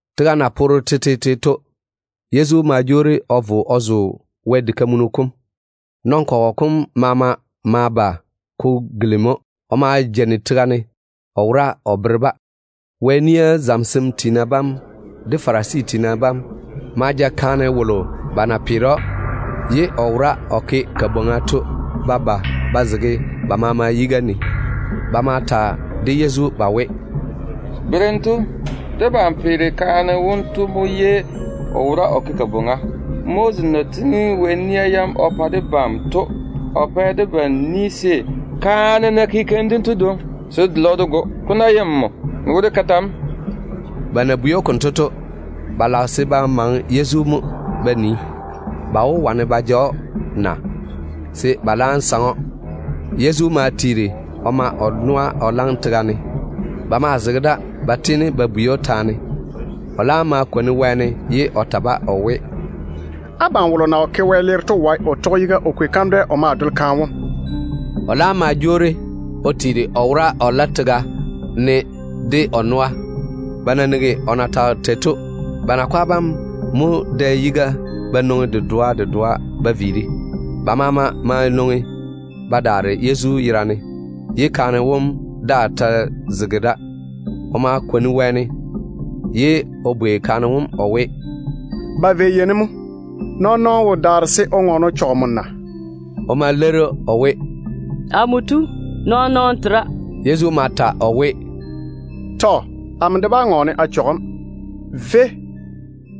Tega na poore tetete to, Yezu ma jwoori o vo o zo Wɛ diga kam. Nɔn-kɔgɔ kom maama ma ba ko gilimi‑o. O ma jeini tega ne o wora o bere-ba. Wɛ nia zamesem tiina bam de Farisi tiina bam ma ja kaane wolo ba na peere‑o bwoorim baŋa ne to ba ba ba zege ba maama yiga ne. Ba ma ta de Yezu ba we, “Berem tu, debam peere kaane wonto bwoorim baŋa ne mo. Moses na tiŋi Wɛ nia yam o pa debam to, o pɛ debam ni se, kaane ná ke keim dento dwoŋi, se dé dole‑o dé go. Ko nam ná ye nmo, n we dé ke tɛ mo?” Ba na bwei‑o konto to, ba lage se ba maŋe Yezu mo ba nii, ba wó wane ba ja‑o na, se ba laam saŋe‑o. Yezu ma tiiri o ma o noa o la tega ne. Ba maa zege da ba tiini ba bwei‑o taane dem. O laam ma kwoni wɛɛne ye o ta-ba o we, “Abam wolo na wo ke wɛleere to wae o tɔge yiga o kwei kandwɛ o ma dole kaane wom.” O laam ma jwoori o tiiri ye o wora o la tega kam de o noa. Ba na nigi o na tage tei to, ba nakwa bam mo dɛ yiga ba nwoŋi dedoa dedoa ba viiri. Ba maama ma nwoŋi ba daare Yezu yerane, ye kaane wom daa ta zege da. O ma kwoni wɛɛne, ye o bwei kaane wom o we, “Ba vei yei ne mo? Nɔɔn-nɔɔno wo daare se o ŋɔɔne o chɔge nmo na?” O ma leiri o we, “Amo tu, ba wolowolo daa wo daare.” Yezu ma ta o we, “Amo de nam bá ŋɔɔne a chɔge‑m. Véi,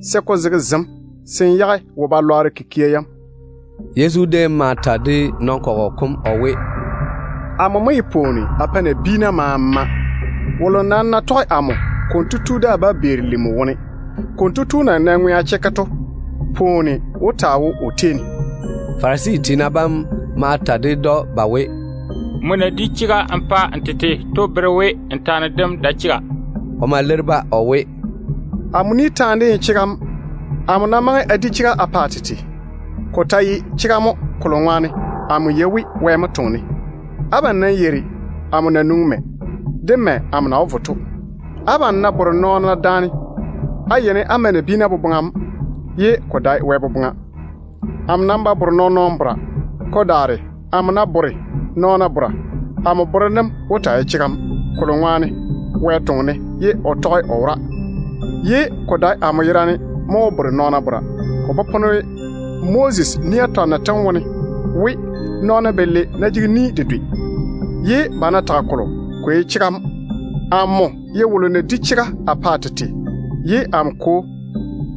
se ko zege zem se n daa‑n yé tusi.”] Yezu déem ma ta de nɔn-kɔgɔ kom o we, “Amo mo ye pwooni a pae nabiina maama. Wolo nam ná tɔge amo, konto tu daa bá beeri lim wone. Konto tu na nɛ ŋwea chekke to, pwooni wó taa wo o tei ne.” Farisi tiina bam ma ta ded‑o ba we, “Nmo na pae n tete chega to bere we n taane dem ba jege kuri.” O ma leiri-ba o we, “Amo ni taane dem seene de ye chega mo. Amo ná maŋe a pa a tete chega, ko ta ye chega mo, kolo ŋwaane amo yei we Wɛ mo toŋe-ne. Abam nam yeiri amo na nwoŋi mɛ, de mɛ amo na wó vo to. Abam ná bore nɔɔna daane, á yeini á ma nabiina boboŋa mo, ye ko dae Wɛ boboŋa. Amo nam ba bore nɔɔn-nɔɔno bora. Ko daare, amo ná bore nɔɔna bora, amo borem dem wó taa ye chega, kolo ŋwaane a Kwo mo toŋe-ne ye o zege a chega kam kwaga ne. Ko dae amo yerane mo wó di nɔɔna taane. Ko popone Moses nia twanno tem wone we, nɔɔna balei ná jege ni dedwe, ye ba ná tage kolo, ko ye chega mo. Amo ye wolo na pae a tete chega, ye amo Kwo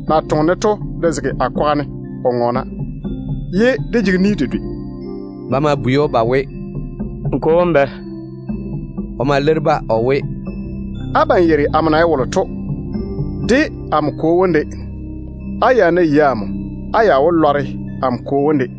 na toŋe-ne to de zege a kwaga ne o ŋɔɔna, ye dé jege ni dedwe.” Ba ma bwei‑o ba we, “N kwo wom bɛ?” O ma leiri-ba o we, “Abam yeiri amo na ye wolo to, de amo Kwo wom de. Á ya ná yei amo, á ya wó lɔre amo Kwo wom de.”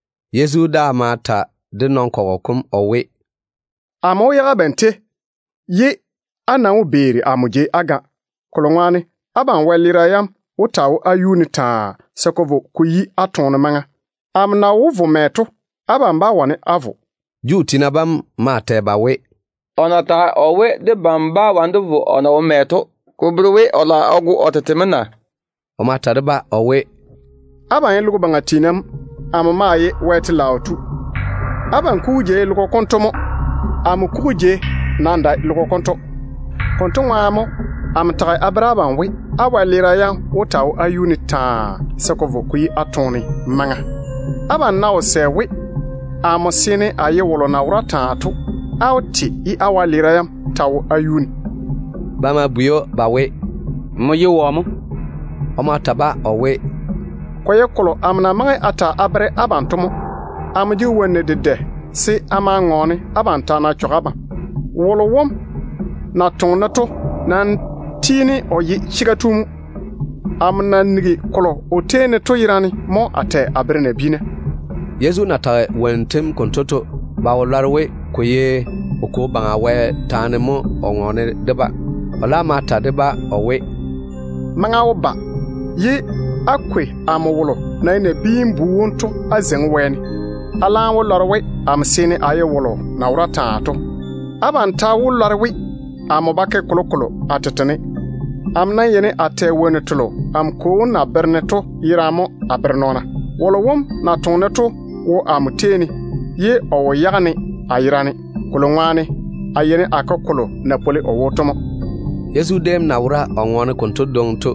Yezu daa ma ta de nɔn-kɔgɔ kom o we, “Amo wó viiri a daare abam, ye á nam wó beeri amo jei á ga, kolo ŋwaane abam wɛleera yam wó taa wo á yuu ne taa, se ko vo ko yi á toone maŋa. Amo na wó vo mɛ to, abam bá wane da á vo.” Juu tiina bam maa tɛ ba we, “O na tage o we, debam bá wane dé vo o na wó vo mɛ to, ko bere we o lage o go o tete mo na?” O ta ma ta de-ba o we, “Abam ye logo baŋa nɔɔna mo, amo nam nwoŋi wɛyuu mo. Abam kugu jei ye logo baŋa ywo mo. Amo kugu jei nam dae logo konto. Konto ŋwaane mo amo tage a bere abam we, á wɛleera yam wó taa wo á yuu ne taa, se ko vo ko yi á toone maŋa. Abam ná wo sɛ we, amo mo seene a ye wolo na wora taa to, á wó te ye á wɛleera yam ta wo á yuu ne.” Ba ma bwei‑o ba we, “Nmo ye wɔ mo?” O ma ta-ba o we, “Ko ye kolo amo na maŋe a ta a bere abam to mo. Amo jege wonnu dedɛ se a maa ŋɔɔne abam taane a chɔge abam. Wolo wom na toŋe-ne to nam tiini o ye chega tu mo. Amo na nigi kolo o tei ne to yerane mo a tɛ a bere nabiina.” Yezu na tage wonnu tem konto to, ba wo lɔre we ko ye o Kwo Baŋa Wɛ taane mo o ŋɔɔne de-ba. O laam ma ta de-ba o we, “Maŋa wó ba ye á kwei amo wolo na ye Nabiin-bu wom to á zeiŋi wɛɛne. Á laam wó lɔre we amo seene a ye wolo na wora taa to. Abam ta wó lɔre we amo ba ke kolokolo a tete ne. Amo nam yeini a tɛ wonnu telo amo Kwo wom na bere-ne to yerane mo a bere nɔɔna. Wolo wom na toŋe-ne to wo amo tei ne, ye o wo yage-ne a yerane, kolo ŋwaane a yeini a ke kolo na pwoli o wo to mo.” Yezu déem na wora o ŋɔɔna konto dwoŋi to,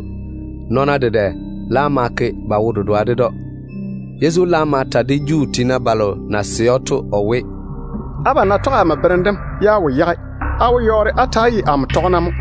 nɔɔna dedɛ laam ma ke ba wo-dedoa ded‑o. Yezu laam ma ta de Juu tiina balo na sɛ‑o to o we, “Abam ná tɔge amo berem dem ye á wo yage, á wó yɔɔre á ta‑á ye amo tɔgena mo.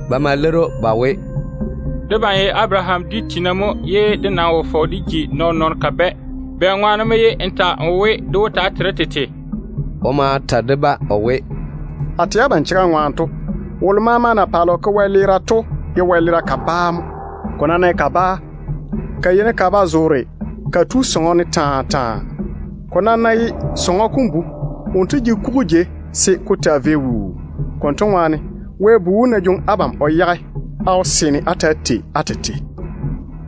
Ba ma leiri‑o ba we, “Debam ye Abaraham dwi tiina mo, ye dé nam wo fɔge dé ji nɔɔn-nɔɔno kabɛ. Bɛ ŋwaane mo ye n ta n we, dé wó taa tei dé tete?” O ma ta de-ba o we, “A tɛ abam chega ŋwaane to, wolo maama na paale o ke wɛleera to ye wɛleera kabaa mo. Ko nam ná ye kabaa, ka yeini ka ba zoore ka tu sɔŋɔ ne taa taa. Ko nam ná ye sɔŋɔ kom bu, wonto jege kugu jei se ko taa vei wuu. Konto ŋwaane, Wɛ Bu wom ná jwoŋi abam o yage, á wó seene á ta‑á tei á tete.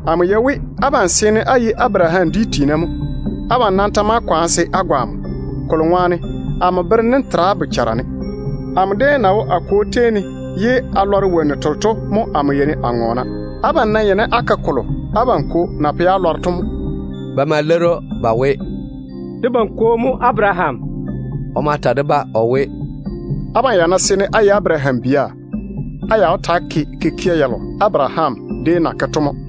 Amo yei we abam seene á ye Abaraham dwi tiina mo. Abam nam ta maa kwaane se á go amo, kolo ŋwaane amo berem dem tera á bochara ne. Amo déem na wo a Kwo tei ne ye a lɔre wonnu telo to mo a yeini a ŋɔɔna. Abam nam yeini á ke kolo abam kwo na pɛ á lɔre to mo.” Ba ma leiri‑o ba we, “Debam kwo mo Abaraham.” O ma ta-ba o we, “Abam ya ná seene á ye Abaraham bia, á ya wó ta‑á ke kikia yalo Abaraham déem na ke to mo.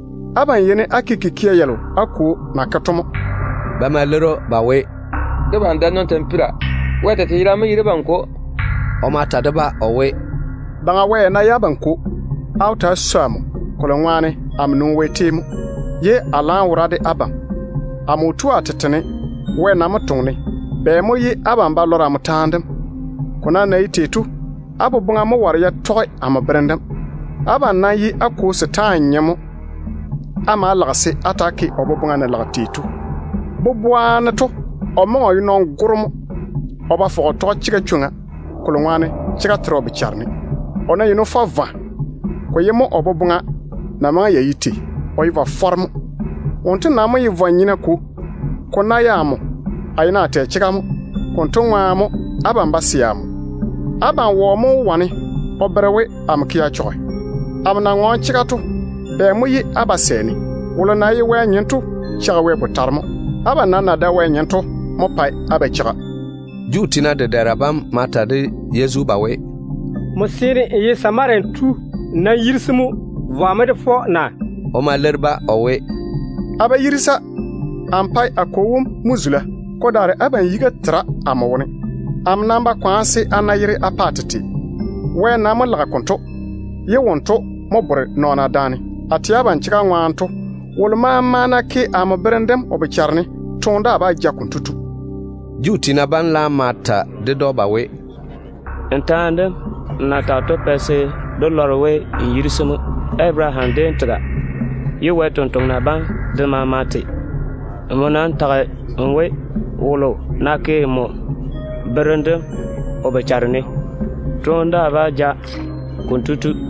Abam yeini á ke kikia yalo á kwo na ke to mo.” Ba ma leiri‑o ba we, “Debam dae tampira. Wɛ tete yerane mo ye debam Kwo.” O ma ta de-ba o we, “Baŋa Wɛ ya ná ye abam Kwo, á wó ta‑á swoi amo, kolo ŋwaane amo nwoŋi Wɛ tei mo, ye a laam wora de abam. Amo wo tu a tete ne. Wɛ nam mo toŋe-ne. Bɛ mo ye abam ba lɔra amo taane dem? Ko nam na ye tei to, á boboŋa mo ware ya tɔge amo berem dem. Abam nam ye á kwo setaane nyem mo. Á ma‑á lage se á ta‑á ke wonto boboŋa na lage tei to. Boboa ne to o maŋe o ye nɔn-goro mo. O ba fɔge o tɔge chega chwoŋa, kolo ŋwaane chega tera o bochare ne. O ná yeini o fɔ vwa, ko ye mo o boboŋa na maŋe ya ye tei. O ye vwa-fɔro mo. Wonto nam mo ye vwa-nyena kwo. Ko ná ye amo, a yeini a tɛ chega mo. Konto ŋwaane mo abam ba sɛ amo. Abam wɔ mo wó wane o bere we amo ke a chɔge? Amo na ŋɔɔne chega to, bɛ mo ye á ba sɛ-ne? Wolo na ye Wɛ nyem to cheigi Wɛ botare mo. Abam nam na dae Wɛ nɔɔna to mo pae á ba cheiga.” Juu tiina dedɛɛra bam ma ta de Yezu ba we, “Nmo seene n ye Samaria tu. N nam yirisi mo. Vwa mo dé fɔ na?” O ma leiri-ba o we, “A ba yirisa. Amo pae a Kwo wom mo zula. Ko daare abam yiga nam tera amo wone. Amo ba kwaana se a na yere a pa a tete. Wɛ nam mo lage se konto ke, ye wonto mo bore nɔɔna daane. A tɛ abam chega ŋwaane to, wolo maama ná toŋe o tɔge amo berem dem, toone daa bá ja konto tu.” Juu tiina bam laam ma ta ded‑o ba we, “N taane dem nmo na tage to pɛ se dé lɔre we n yirisi mo. Abaraham déem tega, ye Wɛ sampwori sem de maama te. Nmo nam ta tage n we, wolo ná toŋe o tɔge nmo berem dem, toone daa bá ja konto tu.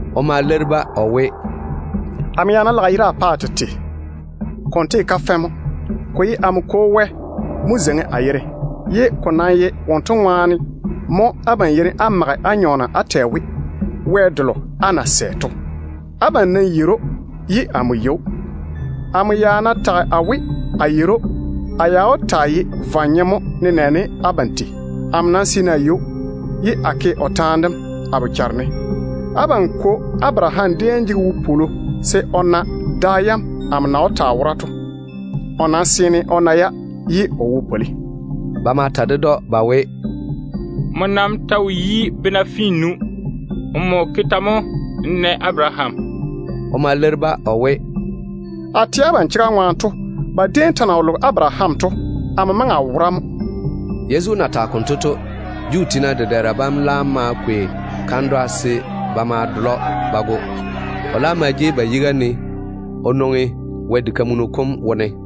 O ma leiri-ba o we, “Amo ya ná lage yere a pa a tete, konto ye kafɛ mo. Ko ye amo Kwo Wɛ mo zeiŋi a yere, ye ko nam ye wonto ŋwaane mo abam yeini á mage á nyɔɔna á tɛ we, Wɛ delo á na sɛ to. Abam nam yeiri‑o, ye amo yei‑o. Amo ya ná tage a we, a yeiri‑o, a ya wó taa ye vwa-nyem mo, nenɛɛne abam tei. Amo nam seene a yei‑o, ye a toŋe a tɔge o berem dem. Abam kwo Abaraham déem jege wopwolo se o na da yam amo na wó taa wora to. O nam seene o na-ya, ye o wo pwoli.” Ba ma ta ded‑o ba we, “Nmo nam ta wo yi bena finnu. Nmo ke tɛ mo n na Abaraham?” O ma leiri-ba o we, “A tɛ abam chega ŋwaane to, ba déem ta na wo loge Abaraham to, amo maŋe a wora mo.” Yezu na tage konto to, ba ma kwei kandwa se ba ma dole‑o ba go. O laam ma seigi o nwoŋi Wɛ diga kam wone.